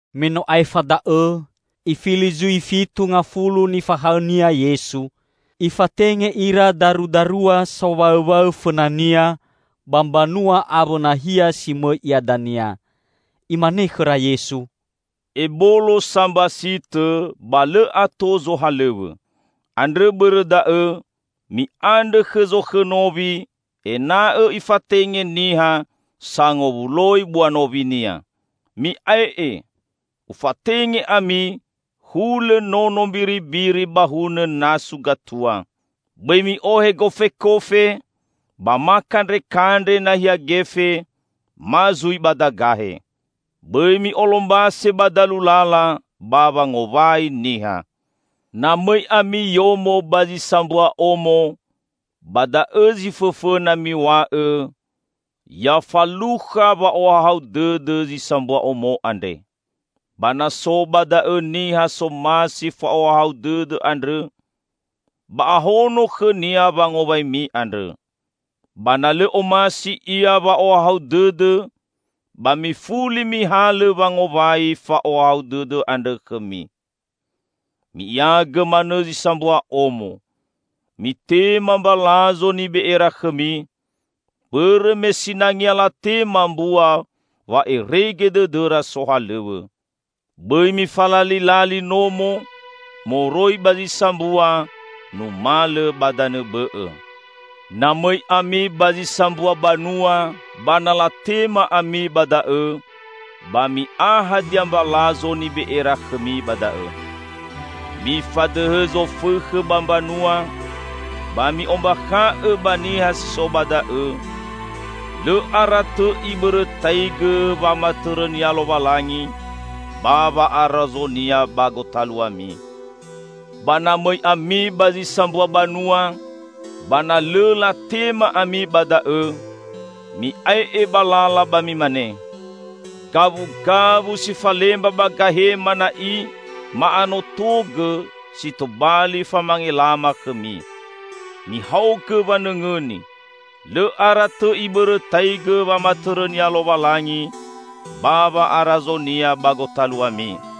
Me no aefa da'õ Ifili zui fitu ngafulu nifahaõ-Nia Yesu. Ifatenge ira darudarua sowaõwaõ fõna-Nia ba mbanua awõ nahia si mõi Ia dania. Imane khõra Yesu, "Ebolo sa mbasitõ, ba lõ ato zohalõw̃õ. Andrõ bõrõ da'õ mi'andrõ khõ Zokhõ nowi ena'õ Ifatenge niha sangowuloi bua nowi-Nia. Mi'ae'e! Ufatenge ami hulõ nono mbiribiri ba hunõ nasu gatua. Bõi mi'ohe gofekofe ba ma kandrekandre nahia gefe, ma zui badagahe. Bõi mi'olombase ba dalu lala ba wangowai niha. Na mõi ami yomo ba zi sambua omo, ba da'õ zi fõfõna miw̃a'õ, 'Ya falukha wa'ohahau dõdõ zi sambua omo andre.' Ba na so ba da'õ niha somasi fa'ohahau dõdõ andrõ, ba ahono khõnia wangowaimi andrõ. Ba na lõ omasi ia wa'ohahau dõdõ ba mifuli mihalõ wangowai fa'ohahau dõdõ andrõ khõmi. Mi'iagõ manõ zi sambua omo. Mitema mbalazo nibe'era khõmi, bõrõ me sinangea latema mbua wa'erege dõdõra sohalõw̃õ. Bõi mifalalilali nomo moroi ba zi sambua numalõ ba danõ bõ'õ. Na mõi ami ba zi sambua banua ba na latema ami ba da'õ, ba mi'a hadia mbalazo nibe'era khõmi ba da'õ. Mifadõhõ zofõkhõ ba mbanua, ba mi'ombakha'õ ba niha si so ba da'õ, 'Lõ ara tõ Ibõrõtaigõ wamatõrõ-Nia Lowalangi ba wa'arazo-Nia ba gotaluami.' Ba na mõi ami ba zi sambua banua, ba na lõ latema ami ba da'õ, mi'ae'e ba lala ba mimane, 'Gawugawu si falemba ba gahema na'i ma'anotogõ si tobali famangelama khõmi. Mihaogõ wanõngõni, lõ ara tõ Ibõrõtaigõ wamatõrõ-Nia Lowalangi ba wa'arazo-Nia ba gotaluami!'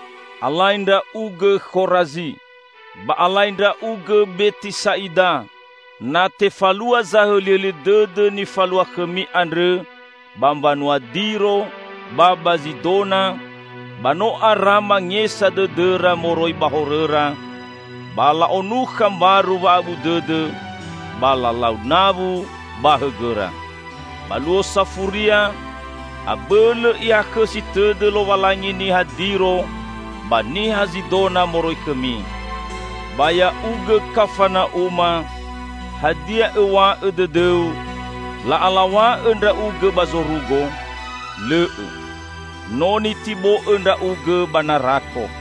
"Alai ndra'ugõ, Khorazi! Ba alai ndra'ugõ, Betisa'ida! Na tefalua zahõlihõli dõdõ nifalua khõmi andrõ ba mbanua Diro ba ba Zidona, ba no ara mangesa dõdõra moroi ba horõra, ba la'onukha mbaru wa'abu dõdõ ba lalau nawu ba hõgõra. Ba luo safuria, abõlõ Ihakhõsi tõdõ Lowalangi niha Diro ba niha Zidona moroi khõmi. Ba ya'ugõ Kafana'uma! Hadia õw̃a'õ dõdõu, la'alaw̃a'õ ndra'ugõ ba zorugo? Lõ'õ. No nitibo'õ ndra'ugõ ba narako!"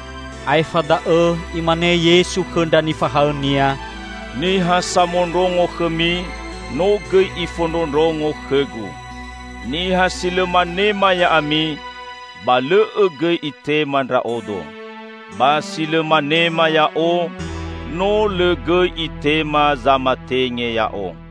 Aefa da'õ Imane Yesu khõ ndra nifahaõ-Nia, "Niha samondrongo khõmi, no gõi ifondrondrongo khõ-Gu. Niha si lõ manema ya'ami, ba lõ'õ gõi itema Ndra'odo. Ba si lõ manema Ya'o, no lõ gõi itema zamatenge Ya'o."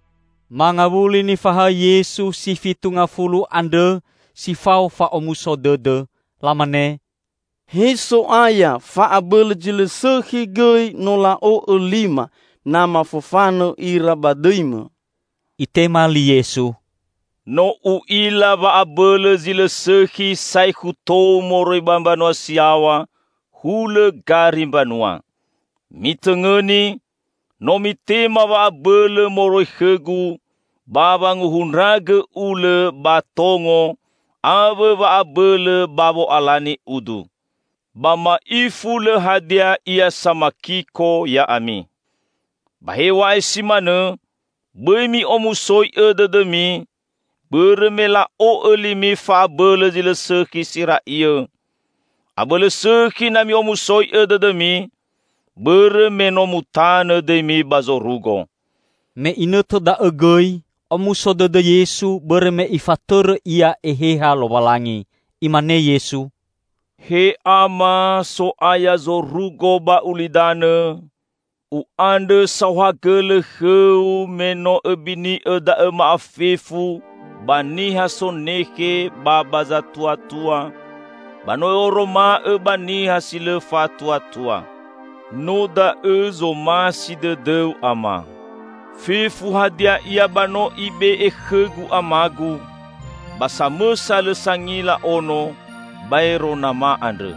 Mangawuli nifahaõ Yesu si fitu ngafulu andrõ si fao fa'omuso dõdõ. Lamane, "He So'aya, fa'abõlõ zi lõ sõkhi gõi no la'o'õ lima na mafofanõ ira ba dõi-Mõ!" Itema li Yesu, "No U'ila wa'abõlõ zi lõ sõkhi saekhu tou moroi ba mbanua si yaw̃a, hulõ gari mbanua. Mitõngõni! No mitema wa'abõlõ moroi khõ-Gu ba wanguhundragõ ulõ ba tongo awõ wa'abõlõ ba wo'alani udu. Ba ma'ifu lõ hadia ia samakiko ya'ami. Ba hew̃a'ae si manõ, bõi mi'omusoi'õ dõdõmi bõrõ me la'o'õ limi fa'abõlõ zi lõ sõkhi si ra'iõ. Abõlõ sõkhi na mi'omusoi'õ dõdõmi bõrõ me no mutanõ dõimi ba zorugo." Me inõtõ da'õ gõi, omuso dõdõ Yesu bõrõ me Ifatõrõ Ia Eheha Lowalangi. Imane Yesu, "He Ama, So'aya zorugo ba ulidanõ! U'andrõ saohagõlõ khõ-U me no Õbini'õ da'õ ma'afefu ba niha sonekhe ba ba zatuatua, ba no Õ'oroma'õ ba niha si lõ fa'atuatua. No da'õ zomasi dõdõ-U, Ama. Fefu hadia ia ba no Ibe'e khõ-Gu ama-Gu. Ba samõsa lõ sangila Ono, baero Nama andrõ.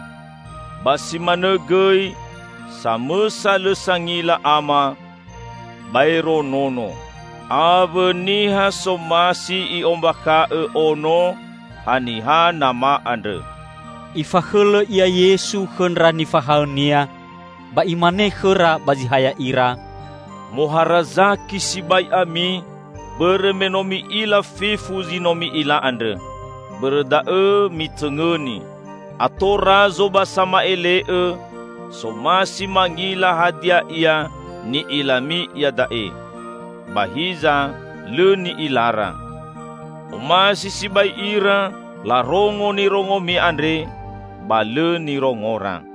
Ba si manõ gõi, samõsa lõ sangila Ama, baero Nono; awõ niha somasi I'ombakha'õ Ono, haniha Nama andrõ." Ifakhõlõ Ia Yesu khõ ndra nifahaõ-Nia, ba Imane khõra ba zi ha ya'ira, "Moharazaki sibai ami, bõrõ me no mi'ila fefu zi no mi'ila andrõ. Bõrõ da'õ mitõngõni: Ato razo ba sama'ele'õ somasi mangila hadia ia ni'ilami iada'e, ba hiza lõ ni'ilara. Omasi sibai ira larongo nirongomi andre, ba lõ nirongora."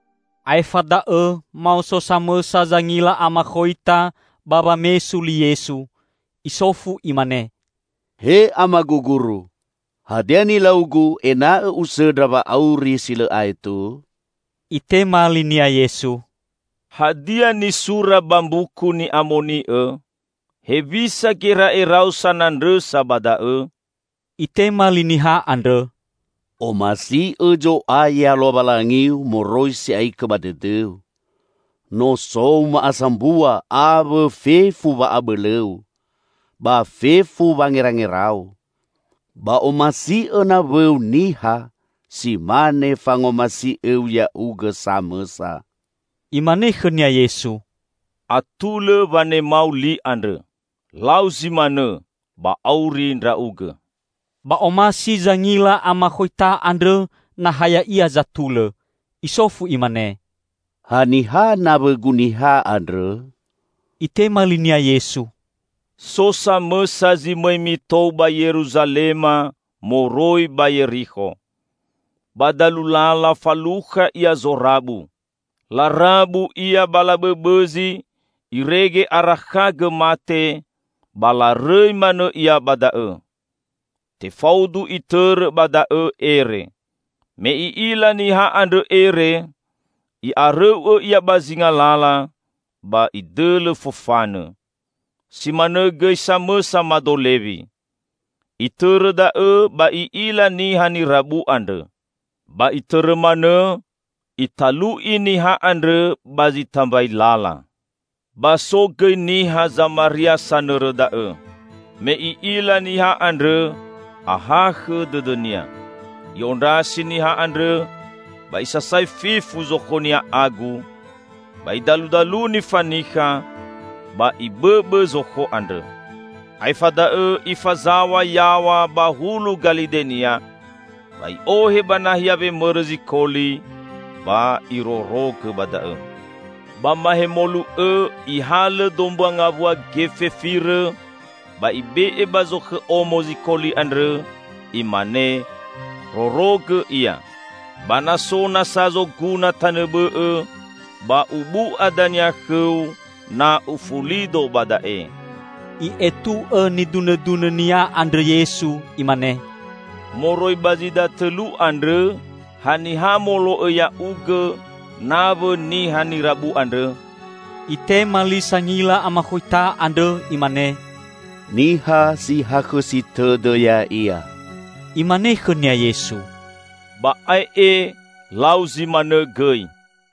Aefa da'õ maoso samõsa zangila amakhoita ba wamesu li Yesu. Isofu imane, "He Amagu Guru, hadia nilaugu ena'õ usõndra wa'auri si lõ aetu?" Itema linia Yesu, "Hadia nisura ba Mbuku Ni'amoni'õ? Hewisa gera'erau sanandrõsa ba da'õ?" Itema li niha andrõ, "'Omasi'õ Zo'aya Lowalangiu moroi si'aikõ ba dõdõu, nosou ma'asambua awõ fefu wa'abõlõu, ba fefu wangerangerau,' ba 'Omasi'õ nawõu niha si mane fangomasi'õu ya'ugõ samõsa.'" Imane khõnia Yesu, "Atulõ wanemau li andrõ. Lau zi manõ, ba auri ndra'ugõ." Ba omasi zangila amakhoita andrõ na ha ya'ia zatulõ. Isofu imane, "Haniha nawõgu niha andrõ?" Itema linia Yesu, "So samõsa zi mõi mitou ba Yeruzalema moroi ba Yerikho. Ba dalu lala falukha ia zorabu. Larabu ia ba labõbõzi irege arakhagõ mate, ba larõi manõ ia ba da'õ. Tefaudu itõrõ ba da'õ ere. Me i'ila niha andrõ ere, i'arõu'õ ia ba zinga lala, ba idõlõ fofanõ. Si manõ gõi samõsa mado Lewi. Itõrõ da'õ ba i'ila niha nirabu andrõ. Ba itõrõ manõ, italu'i niha andrõ ba zi tambai lala. Ba so gõi niha Zamaria sanõrõ da'õ. Me i'ila niha andrõ, ahakhõ dõdõnia. I'ondrasi niha andrõ ba isasai fefu zokhonia agu, ba idaludaluni fanikha, ba ibõbõ zokho andrõ. Aefa da'õ ifazaw̃a yaw̃a ba hulu galidenia ba i'ohe ba nahia wemõrõ zikoli ba irorogõ ba da'õ. Ba mahemolu õ ihalõ dombua ngawua gefe firõ ba ibe'e ba zokhõ omo zikoli andrõ, imane, 'Rorogõ ia. Ba na so nasa zoguna tanõ bõ'õ, ba ubu'a dania khõu, na ufulido ba da'e.'" I'etu'õ nidunõdunõ-Nia andrõ Yesu, Imane, "Moroi ba zi datõlu andrõ, haniha molo'õ ya'ugõ nawõ niha nirabu andrõ?" Itema li sangila amakhoita andrõ, imane, "Niha si hakhõsi tõdõ ya'ia." Imane khõnia Yesu, "Ba ae'e, lau zi manõ gõi!"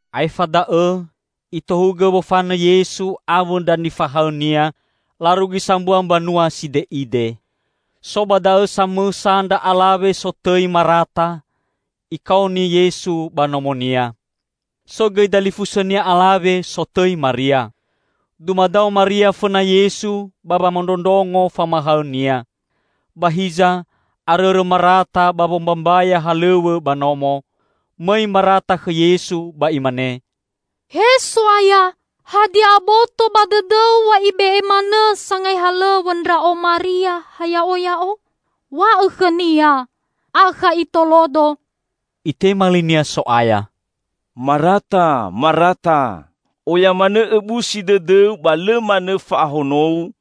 Aefa da'õ Itohugõ wofanõ Yesu awõ ndra nifahaõ-Nia, larugi sambua mbanua side'ide. So ba da'õ samõsa ndra alawe sotõi Marata, ikaoni Yesu ba nomonia. So gõi dalifusõnia alawe, sotõi Maria. Dumadao Maria fõna Yesu ba wamondrongo famahaõ-Nia. Ba hiza arõrõ Marata ba wombambaya halõw̃õ ba nomo. Mõi Marata khõ Yesu ba imane, "He So'aya, hadia aboto ba dõdõ-U wa ibe'e manõ sangai halõw̃õ ndra'o Maria ha ya'oya'o? &Wa'õ khõnia akha itolodo!" Itema linia So'aya, "Marata, Marata! Oya manõ õbusi tõdõu ba lõ manõ fa'ahonou,